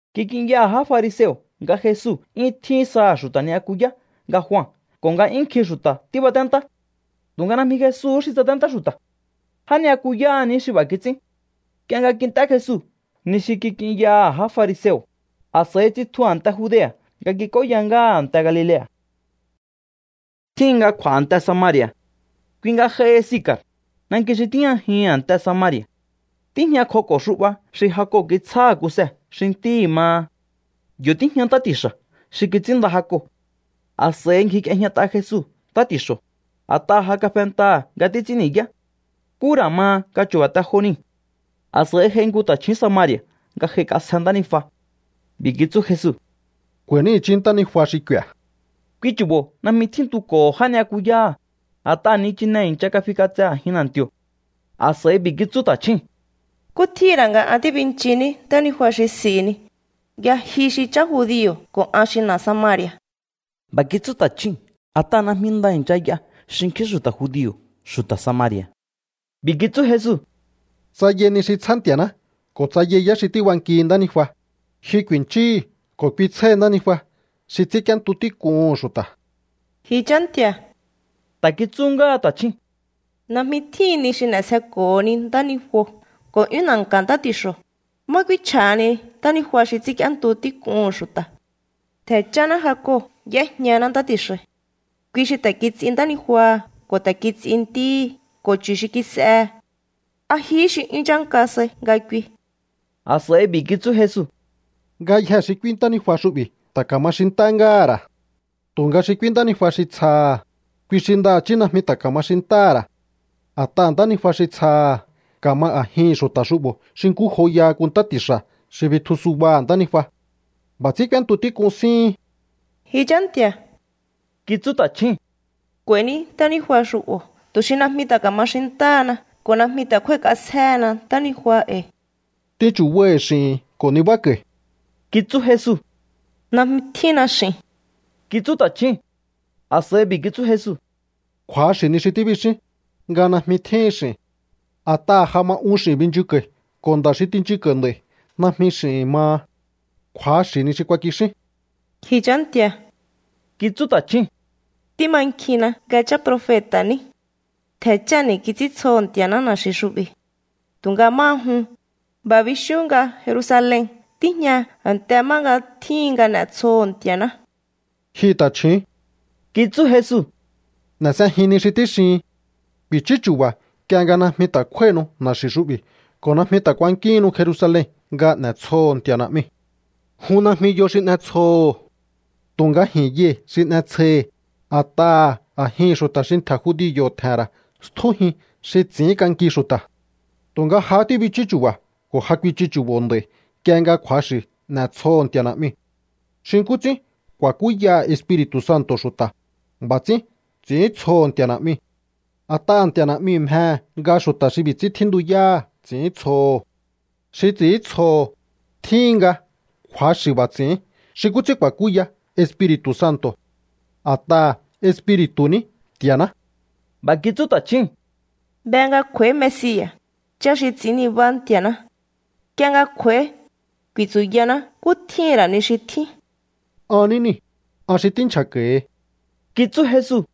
Kik'inyaha̱ já fariseo̱ nga Jesu 'yún tjín saha̱ xu̱ta̱ ni'yakuyá nga Jua ko̱ nga 'yún nkjin xu̱ta̱ tíbaténtá. Tu̱nga najmi Jesu xi tsaténtá xu̱ta̱. Já ni'yakuyáha̱ ní xi b'a̱ kits'ín. Nk'ie nga kint'é Jesu ni xi kik'inyaha̱ já fariseo̱, a̱s'a̱i tsitju a̱nte Judea̱ nga kik'óya ngáha a̱nte Galilea̱. Tjíhin nga kj'u̱a̱ a̱nte Samari̱a̱. Kui nga j'aihi Sicar, nanki xi tíjñajihi̱n a̱nte Samari̱a̱. Tíjñakjoko̱ xu'ba xi Jacob kitsjáha̱ Kuse xi ntíhi̱ maha. Yo̱ tíjña ntá ti̱xa̱ xi kits'ínnda Jacob. A̱s'a̱i ngjik'iejñat'a Jesu ntá ti̱xo̱, a̱t'aha̱ ja kafentaha̱ nga títs'ín ni̱yá. Nkú ra̱ ma nga chu̱ba̱ te jo niu̱. A̱s'a̱i j'ai nku ta̱chju̱ún Samari̱a̱ nga j'aik'asje ntánijua. B'i̱ kitsú Jesu: —K'u̱a̱i̱ní i̱chí ntánijua xi k'u̱i̱a̱. Kui chu̱bo̱ najmi tjíntuko̱ho̱ já ni'yakuyáha̱, a̱t'aha̱ nichine i̱ncha kafík'atse a̱jin na̱nti̱o̱. A̱s'a̱i b'i̱ kitsú ta̱chjúu̱n: —¿Nkú tjíhi̱n ra̱ nga an tíbinchihiní ntánijua xi s'i̱hini, nga ji xi chá judio̱ ko̱ an xi na̱ Samari̱a̱? B'a̱ kitsú ta̱chjúu̱n a̱t'aha̱ najmi nda i̱ncha y'a xinkjín xu̱ta̱ judio̱ xu̱ta̱ Samari̱a̱. B'i̱ kitsú Jesu: —Tsa yai ni xi tsjá Nti̱a̱ná ko̱ tsa yai yá xi tíbankihi ntánijua, ji ku̱i̱nchíhi̱ ko̱ kui tsjáhi ntánijua xi ts'ínk'íéntu tík'uhu̱n xu̱ta̱. —Ji chá nti̱a̱ —ta̱ kitsú ngáha ta̱chjúu̱n—, najmi tjíhin ni xi n'e̱sjeko̱honi ntánijuo̱ ko̱ 'yún na̱nka̱ ntá ti̱xo̱. ¿Má k'úínchj'ahani ntánijua xi ts'ínk'íéntu tík'uhu̱n xu̱ta̱? Ntje̱ cháná Jacob y'éjñaná ntá ti̱xa̱i̱. Kui xi ta̱ kits'i ntánijuaha̱ ko̱ ta̱ kits'i ntíhi̱ ko̱ chu̱ xi kis'ehe̱. ¿A jihí xi 'yún chánka sai nga kui? A̱s'a̱i b'i̱ kitsú Jesu: —Ngayjee̱ xi k'úí ntánijua xu'bi̱ ta̱ ka̱ma xintá ngáha̱ ra̱. Tu̱nga xi k'úí ntánijua xi tsjaha̱, kui xi ndaha̱chí najmi ta̱ ka̱ma xintáha̱ ra̱. A̱t'aha̱ ntánijua xi tsjaha̱ ka̱ma a̱jihi̱n xu̱ta̱ xu'bo̱ xi nkú joyaha nku ntá ti̱xa̱ xi bitju subaha̱ ntánijua. B'a̱ ts'ín k'úéntu tík'un síhin. —Ji chá nti̱a̱ —kitsú ta̱chjúu̱n—, k'u̱a̱i̱ní ntánijua xu'bo̱ tu̱ xi najmi ta̱ ka̱ma xintáhana ko̱ najmi ta̱ kj'úái̱k'asjéhena ntánijua e̱i̱. —T'in chu̱baihi̱ x'i̱hi̱n ko̱ nibáko̱i̱ —kitsú Jesu. —Najmi tjínna x'i̱n —kitsú ta̱chjúu̱n. A̱s'a̱i b'i̱ kitsú Jesu: —Kju̱axi̱ ni xi tíbixín, nga najmi tjíhin x'i̱n. A̱t'aha̱ ja ma un x'i̱n binchunko̱i̱ ko̱ nda̱ xi tinchunko̱i̱ nd'a̱i̱ najmi x'i̱hi̱n maha. Kju̱axi̱ ni xi kuakixín. —Ji chá nti̱a̱ —kitsú ta̱chjúu̱n—, tímankjinna nga chá profeta̱ ní. Ntje̱ cháni̱ kits'íntsjoho̱ Nti̱a̱ná na̱xi̱ xu'bi̱. Tu̱nga máha jun, b'a̱ bixíún nga Jerusalen tíjña a̱nte má nga tjíhin nga n'e̱tsjoho̱ Nti̱a̱ná. —Ji ta̱chju̱ún —kitsú Jesu—, n'e̱ s'ejin ni xi tíxihin. Ku̱i̱chú chu̱ba̱ nk'ie nga najmi ta̱ kjúái̱hinu na̱xi̱ xu'bi̱ ko̱ najmi ta̱ kuankíhinnu Jerusalen nga n'e̱tsjoho̱o Nti̱a̱ Na̱'miu̱. Jun najmi yo xi n'etsjoho̱o. Tu̱nga ji̱n yai̱ xi n'etsjoi̱hi̱, a̱t'aha̱ a̱jihi̱n xu̱ta̱ xi ntje̱ judio̱ tje̱he̱n ra̱ stjújin xi ts'i̱ínk'anki xu̱ta̱. ’Tu̱nga jahá tíbichú chu̱ba̱ ko̱ ja kuichu chu̱bo̱ nd'a̱i̱ nk'ie nga kju̱axi̱ n'etsjoho̱ Nti̱a̱ Na̱'miu̱. Xi nkú ts'ín ku̱a̱kúyaha̱ Espiri̱tu̱ Santo̱ xu̱ta̱, b'a̱ ts'ín ts'i̱íntsjoho̱ Nti̱a̱ Na̱'miu̱. A̱t'aha̱ Nti̱a̱ Na̱'miu̱ mjehe̱ nga xu̱ta̱ xi b'i̱ ts'ín tjíntuyáha̱ ts'i̱íntsjoho̱. Xi ts'i̱íntsjoho̱, tjíhin nga kju̱axi̱ b'a̱ ts'i̱ín xi nkú ts'ín ku̱a̱kúya Espiri̱tu̱ Santo̱. A̱t'aha̱ Espiri̱tu̱ ní Nti̱a̱ná. B'a̱ kitsú ta̱chjúu̱n: —Be nga kj'u̱a̱í Mesia̱, chá xi ts'i̱ín nibá Nti̱a̱ná. Nk'ie nga kj'u̱a̱í, ku̱i̱tsu̱yaná nkú tjíhi̱n ra̱ ni xi tjín. —An ní niu̱, an xi tínchja̱ko̱hi —kitsú Jesu.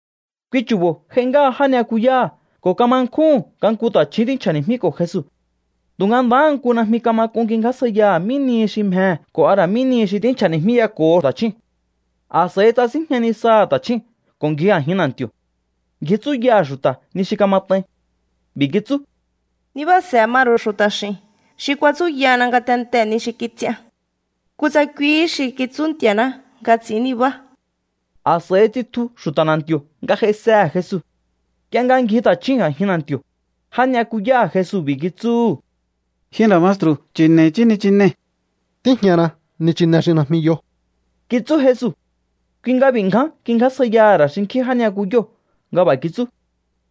Kui chu̱bo̱ j'ai ngáha já ni'yakuyáha̱ ko̱ kama nkjúhu̱n nga nku ta̱chju̱ún tínchja̱ni̱jmíko̱ Jesu. Tu̱nga ndaha nku najmi kama k'un kingjásjaiyaha̱ mí nihi xi mjehe̱ ko̱ a ra̱ mí nihi xi tínchja̱ni̱jmíyako̱ho ta̱chjúu̱n. A̱s'a̱i tsasínjña nisaha̱ ta̱chjúu̱n ko̱ ngji a̱jin na̱nti̱o̱. Ngji tsúyaha̱ xu̱ta̱ ni xi kamat'ain. B'i̱ kitsú: —Nibáa̱se̱ ma ru̱u xu̱ta̱ x'i̱n xi kuatsúyana ngatentee̱ ni xi kits'ian. Kutsa kuihí xi kitsú Nti̱a̱ná nga ts'i̱ín nibá. A̱s'a̱i tsitju xu̱ta̱ na̱nti̱o̱ nga j'aisehe̱ Jesu. Nk'ie nga ngji ta̱chjúu̱n a̱jin na̱nti̱o̱, já ni'yakuyáha̱ Jesu b'i̱ kitsúhu̱: —Ji nda̱ maestru̱, chi̱ne̱i̱ i̱chí nichinei̱. —Tíjñana nichine xi najmi yo —kitsú Jesu. Kui nga b'i̱ ngján kingjásjaiyaha̱ ra̱ xinkjín já ni'yakuyóo̱ nga b'a̱ kitsú: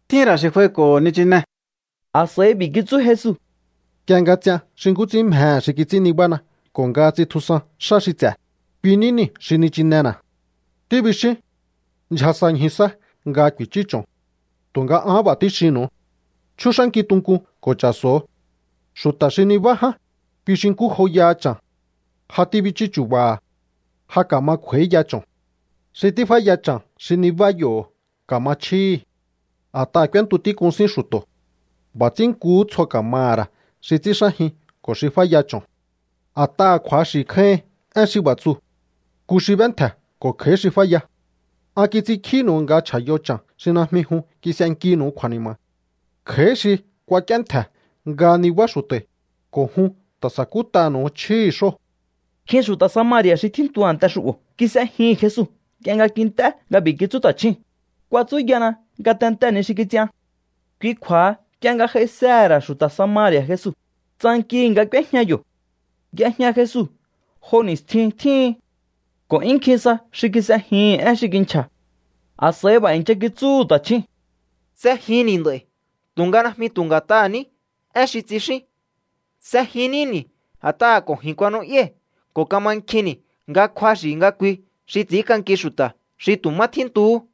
—Tjín ra̱ xi kj'uaiko̱ho̱ nichine. A̱s'a̱i b'i̱ kitsú Jesu: —Nk'ie nga ts'ian xi nkú ts'ín mjehe̱ xi kits'ín nibána ko̱ nga ts'intjusan xá xi ts'e̱, kui ní niu̱ xi nichinena̱. Tíbixíún: “Ndyja sa ñju sá nga ku̱i̱chú cho̱n.” Tu̱nga an b'a̱ tíxinnu̱u: Chjúx'ánkiu tunkun ko̱ cha̱so̱o. Xu̱ta̱ xi nibá ján, kui xi nkú joyaha cha̱n. Ja tíbichú chu̱ba̱ha̱. Ja ka̱ma kj'u̱a̱íya cho̱n. Xi tíf'áya cha̱n xi nibá yo̱ ka̱ma chjíhi̱. A̱t'aha̱ k'úéntu tík'un sín xu̱to̱. B'a̱ ts'ín nkuhú tsjo ka̱maha̱ ra̱ xi ts'ínxájin ko̱ xi f'áya cho̱n. A̱t'aha̱ kju̱axi̱ kjáíhin én xi b'a̱ tsuu̱: “Nku xi b'éntje̱ ko̱ kj'a̱í xi f'áya.” An kits'inkjínu̱u nga chj'a̱yo cha̱n xi najmi jun kis'enkinu̱u kju̱a̱ni̱ma̱. Kj'a̱í xi kuak'íéntje̱ nga nibá xu̱ta̱i̱, ko̱ jun ta̱ sakút'anu̱u chjíhi̱ xóo̱. Nkjin xu̱ta̱ Samari̱a̱ xi tjíntu a̱nte xu'bo̱ kis'ejihi̱n Jesu nk'ie nga kint'é nga b'i̱ kitsú ta̱chjúu̱n: “Kuatsúyana ngatentee̱ ni xi kits'ian.” Kui kju̱a̱ha nk'ie nga j'aisehe̱ ra̱ xu̱ta̱ Samari̱a̱ Jesu, tsankihi̱ nga k'úéjña yo̱. Y'ejña Jesu jo ni̱stjin tjíhin ko̱ 'yún nkjin sa xi kis'ejihi̱n én xi kinchja̱. A̱s'a̱i b'a̱ i̱ncha kitsúhu̱ ta̱chjúu̱n: —S'ejinni̱ nd'a̱i̱ tu̱nga najmi tu̱ nga̱t'aha̱ ní én xi tsixín. S'ejin níni̱ a̱t'aha̱ ko̱ ji̱n kuanu'yái̱ ko̱ mankjinni̱ nga kju̱axi̱ nga kui xi ts'ínk'anki xu̱ta̱ xi tu̱ má tjíntuhú.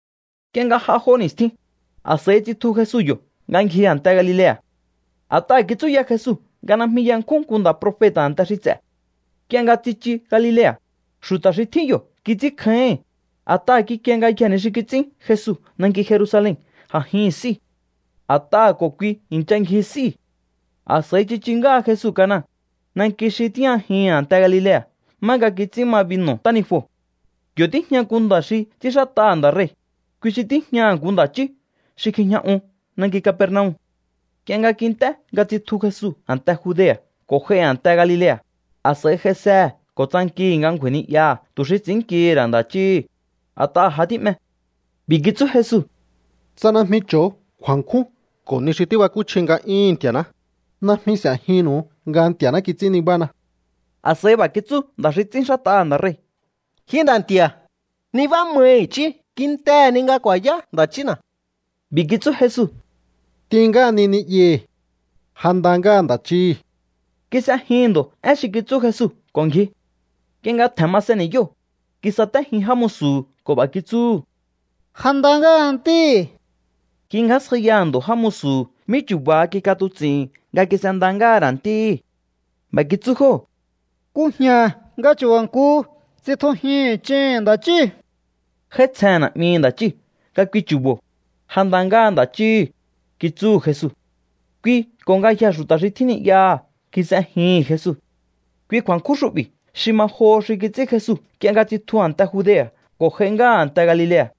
Nk'ie nga j'a jo ni̱stjin, a̱s'a̱i tsitju Jesu yo̱ nga ngji a̱nte Galilea̱. A̱t'aha̱ kitsúya Jesu nga najmi yankjún nku nda̱ profeta̱ a̱nte xi ts'e̱. Nk'ie nga tsichu Galilea̱, xu̱ta̱ xi tjín yo̱ kits'ínkjáíhi̱n, a̱t'aha̱ kikie ngayjee̱ ni xi kits'ín Jesu nanki Jerusalen a̱jihi̱n s'íu̱. A̱t'aha̱ ko̱ kui i̱ncha ngji s'íu̱. A̱s'a̱i tsichu ngáha Jesu Cana, nanki xi tíjñajihi̱n a̱nte Galilea̱ má nga kits'ín ma binu̱ ntánijuo̱. Yo̱ tíjña nku nda̱ xi ts'ínxát'aha̱ nda̱ rei̱, kui xi tíjñaha̱ nku nda̱ chí xi kjijña un nanki Capernaum. Nk'ie nga kint'é nga tsitju Jesu a̱nte Judea̱ ko̱ j'ai a̱nte Galilea̱, a̱s'a̱i j'aisehe̱ ko̱ tsankihi̱ nga ngju̱a̱i̱ ni'yaha̱ tu̱ xi ts'i̱ínnkihi̱ ra̱ nda̱ chíhi̱, a̱t'aha̱ ja tí'me. B'i̱ kitsú Jesu: —Tsa najmi cho̱o kju̱a̱nkjún ko̱ ni xi tíbakúchji nga'yúhu̱n Nti̱a̱ná, najmi s'e̱jinnu̱u nga Nti̱a̱ná kits'ín nibána. A̱s'a̱i b'a̱ kitsú nda̱ xi ts'ínxát'aha̱ nda̱ rei̱: —Ji nda̱ nti̱a̱, nibá mai i̱chí kintehe̱ ni nga ku̱a̱yá nda̱ chína̱. B'i̱ kitsú Jesu: —T'in ngáhani ni'yahi̱. Ja nda ngáha nda̱ chíhi̱. Kis'ejihi̱n ndo̱ én xi kitsú Jesu ko̱ ngji. Nk'ie nga tje̱n masen ni̱yóo̱, kisatéjin já musu̱hu̱ ko̱ b'a̱ kitsúhu̱: —Ja nda ngáha ntíhi̱. Kingjásjaiyaha̱ ndo̱ já musu̱hu̱ mí chu̱ba̱ha kik'atuts'i̱hi̱n nga kis'e nda ngáha̱ ra̱ ntíhi̱. B'a̱ kitsú jóo̱: —Kujña̱ nga chu̱ba̱ nku tsitjujihi̱n ch'iu̱n nda̱ chíu̱. J'áítsjehe̱n na̱'mihi̱ nda̱ chíu̱ nga kui chu̱bo̱: “Ja nda ngáha nda̱ chíhi̱”, kitsúhu̱ Jesu. Kui ko̱ ngayjee̱ xu̱ta̱ xi tjín ni'yaha̱ kis'ejihi̱n Jesu. Kui kju̱a̱nkjún xu'bi̱ xi ma joho xi kits'ín Jesu nk'ie nga tsitju a̱nte Judea̱ ko̱ j'ai ngáha a̱nte Galilea̱.